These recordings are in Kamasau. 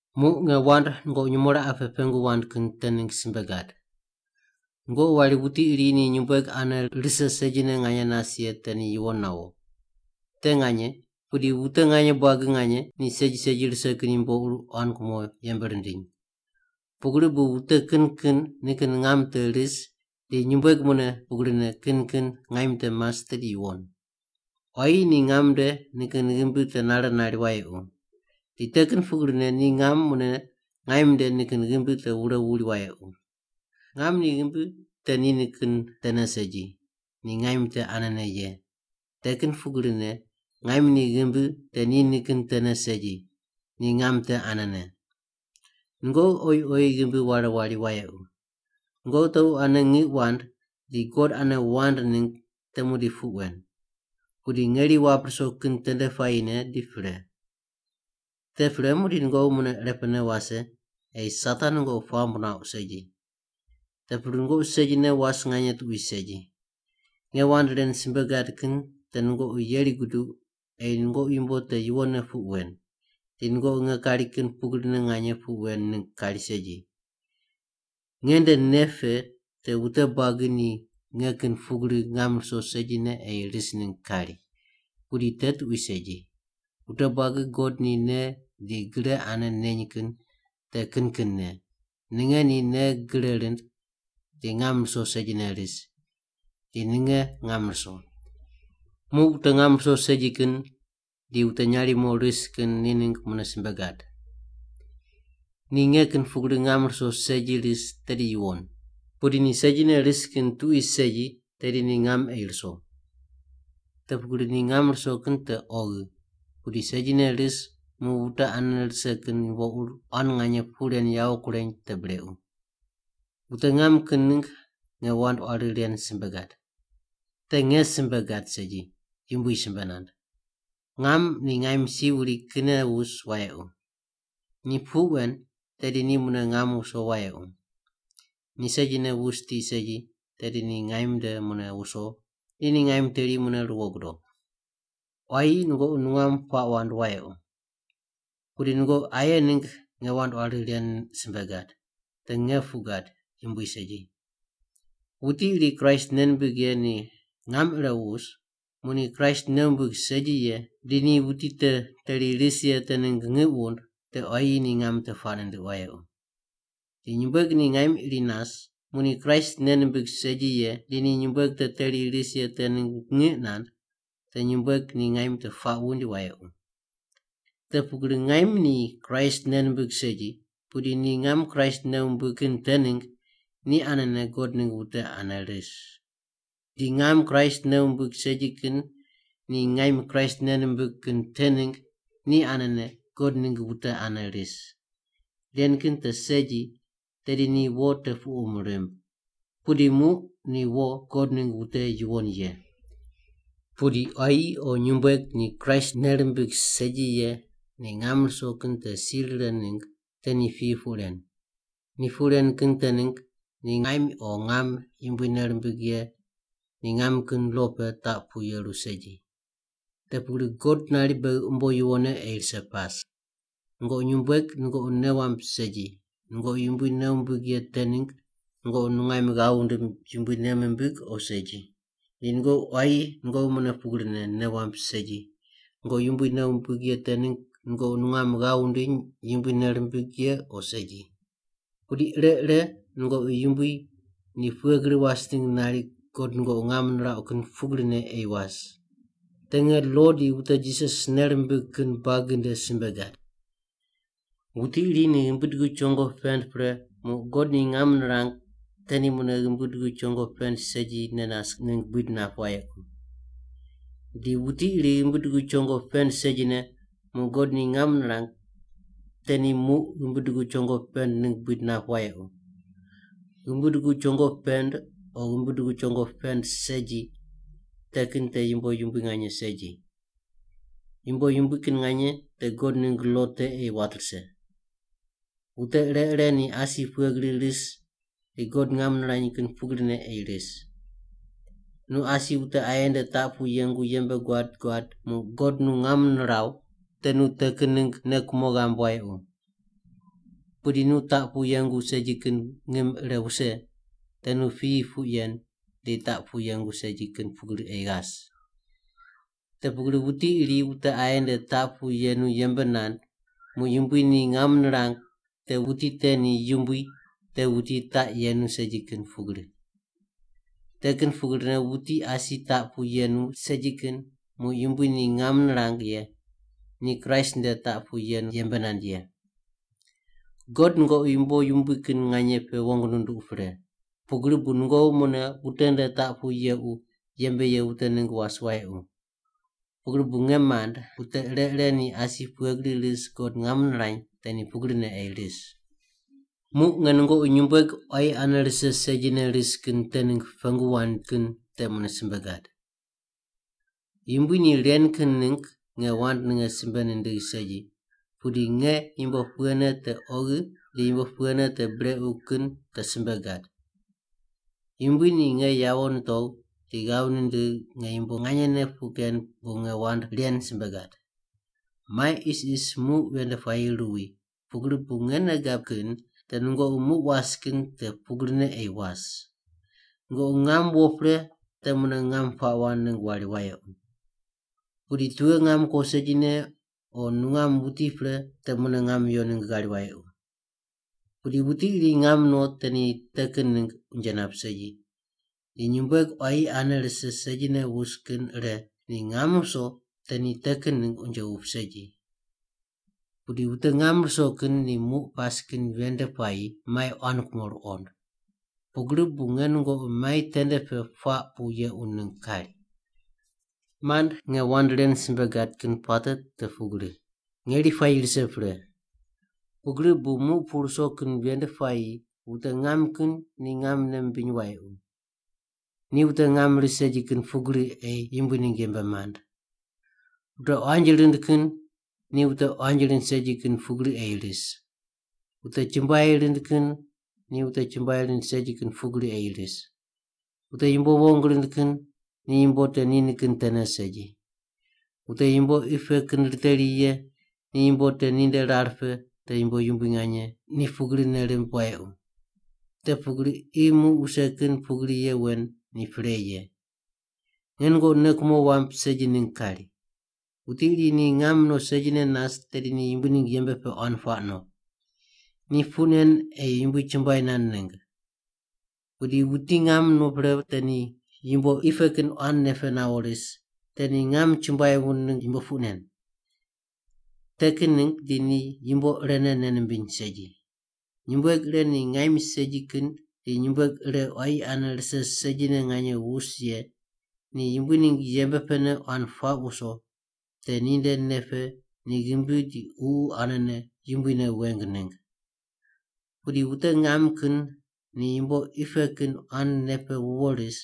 Muq nge wand nungoqi nyumo raqe pe pengu wand kin te ningg simbe gad. Nungoqi wari wuti iri ni nyumbueg ane rise segine nganye nas ye te ni yuwon nawo. Te nganye, pudi wute nganye buagi nganye ni segi segi rise kin yumbo ur quan kumo yembe rindiny. Pugri bu wute kin kin nikin ngam te ris, di nyumbueg mune pugrine kin kin ngaim te mas tedi yuwon. Quayi ni ngam nde nikin ghimbi te nare nari wayequ. Di te kin pugrine ni ngam mune ngaim nde nikin ghimbi te wure wuri wayequ. Ngam ni ghimbi te ni nikin tene segi, ni ngaim te anene ye. Te kin pugrine ngaim ni ghimbi te ni nikin tene segi, ni ngam te anene. Nungoqi oyi oyi ghimbi ware wari wayequ. Nungoqi tequ ane ngiq wand di God ane wand ningg te muqdi puq wen. Pudi ngeri wap ruso kin tende puayine di pre. Te pre muqdi nungoqi mune irepe wase, ei Satan nungoqi puamb nuauq segi. Te pugri nungoqi segine was nganye tuqui segi. Nge wand ren simbe gad kin te nungoqi yeri guduq ei nungoqi yumbo te yuwonne puq wen, di nungoqi nge kari kin pugrine nganye puq wen ningg kari segi. Nge nde nei pe te wute buagi ni nge kin pugri ngam ruso segine ei ris ningg kari. Pudi te tuqui segi. Wute buagi God ni nei di gre ane neny kin te kin kinne, ninge ni nei gre rind di ngam ruso segine ris, di ninge ngam ruso. Muq wute ngam ruso segi kin di wute nyarimo ris kin ni ningg mune simbe gad. Ni nge kin pugri ngam ruso segi ris tedi yuwon. Pudi ni segine ris kin tuqui segi tedi ni ngam ei ruso. Te pugri ni ngam ruso kin te oghi, pudi segine ris muq wute ane rise kin yumbo ur quan nganye puq ren yawo kureny te brequ. Wute ngam kin ningg nge wand quari ren simbe gad. (Te nge simbe gad segi, Yumbui simbe nand.) Ngam ni ngaim si wuri kinne wus wayequ. Ni puq wen tedi ni mune ngam wuso wayequ. Ni segine wus tiq segi tedi ni ngaim nde mune wuso di ni ngaim teri mune ruwo gudo. Quayi nungoqi nungam puaq wand wayequ. Pudi nungoqi aye ningg nge wand quari ren simbe gad. (Te nge puq gad, Yumbui segi.) Wuti iri Kraist nei nimbig ye ni ngam ire wus, muq ni Kraist nei wumbig segi ye, di ni wuti te teri ris ye te ningg ngiq wund, te quayi ni ngam te puaq nindiq wayequ. Di nyumbueg ni ngaim iri nas, muq ni Kraist nei nimbig segi ye, di ni nyumbueg te teri ris ye te ningg ngiq nand, te nyumbueg ni ngaim te puaq wuind wayequ. Te pugri ngaim ni Kraist nei nimbig segi, pudi ni ngam Kraist nei wumbig kin te ningg ni anene God ningg wute ane ris. Di ngam Kraist nei wumbig segi kin ni ngaim Kraist nei nimbig kin te ningg ni anene God ningg wute ane ris. Ren kin te segi, tedi ni wo te puqum rimb. Pudi muq ni wo God ningg wute yuwon ye. Pudi quayi o nyumbueg ni Kraist nei rimbig segi ye ni ngam ruso kin te si rire ningg te ni piyi puq ren. Ni puq ren kin te ningg ni ngaim o ngam Yumbui nei rimbig ye ni ngam kin lo pe taq pu yeru segi. Te pugri God nari beghi umbo yuwonne ei rise pas. Nungoqi nyumbueg nungoqi nei wamb segi nungoqi Yumbui nei wumbig ye te ningg nungoqi nungaim ghav wundim Yumbui nei mimbig o segi. Di nungoqi quayi nungoqi mune pugrine nei wamb segi nungoqi Yumbui nei wumbig ye te ningg nungoqi nungam ghav wundiny Yumbui nei rimbig ye o segi. Pudi ire ire nungoqi Yumbui ni pughe gri was ningg nari God nungoqi ngam nirauq kin pugrine ei was. Te nge lo di wute Jisas nei rimbig kin buagi nde simbe gad. Wuti iri ni ghimbi dugu chongo pend pre muq God ni ngam nirang te ni mune ghimbi dugu chongo pend segine nas ningg buid nap wayequ. Di wuti ghimbi dugu chongo pend segine muq God ni ngam nirang te ni muq ghimbi dugu chongo pend ningg buid nap wayequ. Ghimbi dugu chongo pend o ghimbi dugu chongo pend segi te kin te yumbo yumbui nganye segi. Yumbo yumbui kin nganye te God ningg lo te ei wat rise. Wute ire ire ni asi pughe gri ris di God ngam nirany kin pugrine ei ris. Nu asi wute aye nde taq pu yengu yembe guad guad muq God nu ngam niraw, te nu te kin ningg nei kumo ghamb wayequ. Pudi nu taq pu yengu segi kin ngim ire wuse, te nu piyi puq yen di taq pu yengu segi kin pugri ei ghas. Te pugri wuti iri wute aye nde taq pu yenu yembe nand muq Yumbui ni ngam nirang te wuti te ni Yumbui te wuti taq yenu segi kin pugri. Te kin pugrine wuti asi taq pu yenu segi kin muq Yumbui ni ngam nirang ye ni Kraist nde taq pu yenu yembe nand ye. God nungoqi yumbo yumbui kin nganye pe wong nunduq pre, pugri bu nungoqi mune wute nde taq pu yequ yembe ye wute ningg was wayequ. Pugri bu, nge mand, wute ire ire ni asi pughe gri ris God ngam nirany te ni pugrine ei ris. Muq nge nungoqi nyumbueg quayi ane rise segine ris kin te ningg pengu wand kin te mune simbe gad. Yumbui ni ren kin ningg nge wand ninge simbe nindigh segi, pudi nge yumbo pughene te oghi di yumbo pughene te brequ kin te simbe gad. Yumbui ni nge yawo nitogh di ghav nindigh nge yumbo nganyene puq ken bu nge wand ren simbe gad. Mai isis muq ven nde puayi ruwi, pugri bu nge nei gab kin te nungoqi muq was kin te pugrine ei was. Nungoqi ngam wo pre te mune nungam puaq wand ningg wari wayequ. Wuti tughe ngam kuo segine o nungam wuti pre te mune ngam yo ningg ghari wayequ. Pudi wuti iri ngam no te ni te kin ningg unje nap segi. Di nyumbueg quayi ane rise segine wus kin ire ni ngam wuso te ni te kin ningg unje wup segi. Pudi wute ngam ruso kin ni muq pas kin ven nde puayi mai quan kumo ruqond. Pugri bu nge nungoqi mai tende pe puaq pu yequ ningg kari. Mand, nge wand ren simbe gad kin puate te pugri: Ngeri puayi rise pre. Pugri bu muq pu ruso kin ven nde puayi wute ngam kin ni ngam nei mimbiny wayequ. Ni wute ngam ris segi kin pugri ei Yumbui ningg yembe mand. Wute quanji rind kin ni wute quanji rind segi kin pugri ei ris. Wute chumbuai rind kin ni wute chumbuai rind segi kin pugri ei ris. Wute yumbo wong rind kin ni yumbo te ni nikin tene segi. Wute yumbo qi pe kin riteri ye ni yumbo te ninde rar pe te yumbo yumbui nganye, ni pugri nei rimb wayequ. Te pugri qi muq wuse kin pugri ye wen ni pre ye. Nge nungoqi nei kumo wamb segi ningg kari. Wuti iri ni ngam no segine nas tedi ni Yumbui ningg yembe pe quan puaq no. Ni puq nen ei Yumbui chumbuai nand ningg. Pudi wuti ngam no pre te ni yumbo qi pe kin quan nei pe nawo ris, te ni ngam chumbuai wund ningg yumbo puq nen. Te kin ningg di ni yumbo irene nei nimbiny segi. Nyumbueg ire ni ngaim segi kin di nyumbueg ire quayi ane rise segine nganye wus ye ni Yumbui ningg yembe pene quan puaq wuso, te ninde nei pe ni ghimbi di ququ anene Yumbui ne weng ningg. Pudi wute ngam kin ni yumbo qi pe kin quan nei pe wuwo ris,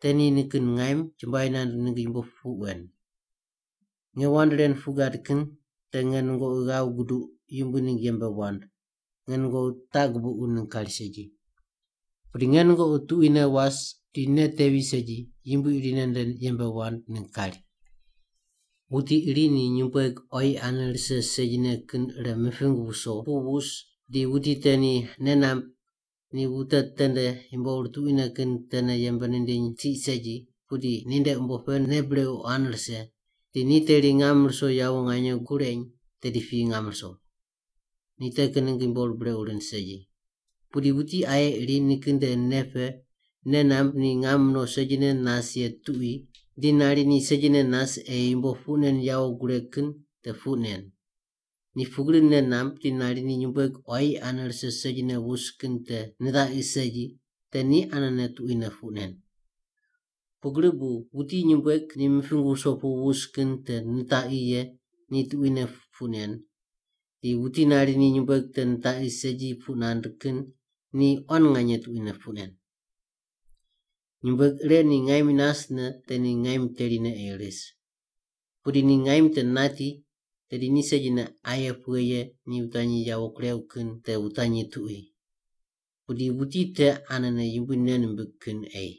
te ni nikin ngaim chumbuai nand ningg yumbo puq wen. Nge wand ren puq gad kin te nge nungoqi ghav guduq Yumbui ningg yembe wand, nge nungoqi taq gubuqu ningg kari segi. Pudi nge nungoqi tuquine was di nei tevi segi Yumbui irine nde yembe wand ningg kari. Wuti iri ni nyumbueg quayi ane rise segine kin ire miping wuso pu wus di wuti te ni nei namb ni wute tende yumbo ur tuquine kin tene yembe nindiny tiq segi pudi ninde umbo pe nei brequ quan rise, di ni teri ngam ruso yawo nganye kureny, tedi piyi ngam ruso. Ni te kin ningg yumbo ur brequ rind segi. Pudi wuti aye iri nikin nde nei pe nei namb ni ngam no segine nas ye tuqui di nari ni segine nas ei yumbo puq nen yawo gureg kin te puq nen. Ni pugri nei namb di nari ni nyumbueg quayi ane rise segine wus kin te nitaqi segi te ni anene tuquine puq nen. Pugri bu wuti nyumbueg ni miping wuso pu wus kin te nitaqi ye ni tuquine puq nen, di wuti nari ni nyumbueg te nitaqi segi puq nand kin ni quan nganye tuquine puq nen. Nyumbueg ire ni ngaim nasne te ni ngaim terine ei ris. Pudi ni ngaim te nati, tedi ni segine aye pughe ye ni wutanyi yawo kurew kin te wutanyi tuqui. Pudi wuti te anene Yumbui nei nimbig kin ei.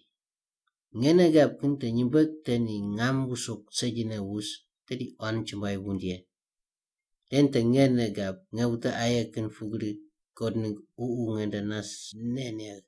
Nge nei gab kin te nyumbueg te ni ngam wuso segine wus, tedi quan chumbuai wund ye. Ren te nge nei gab, nge wute aye kin pugri God ningg Ququ nge nde nas nei negh.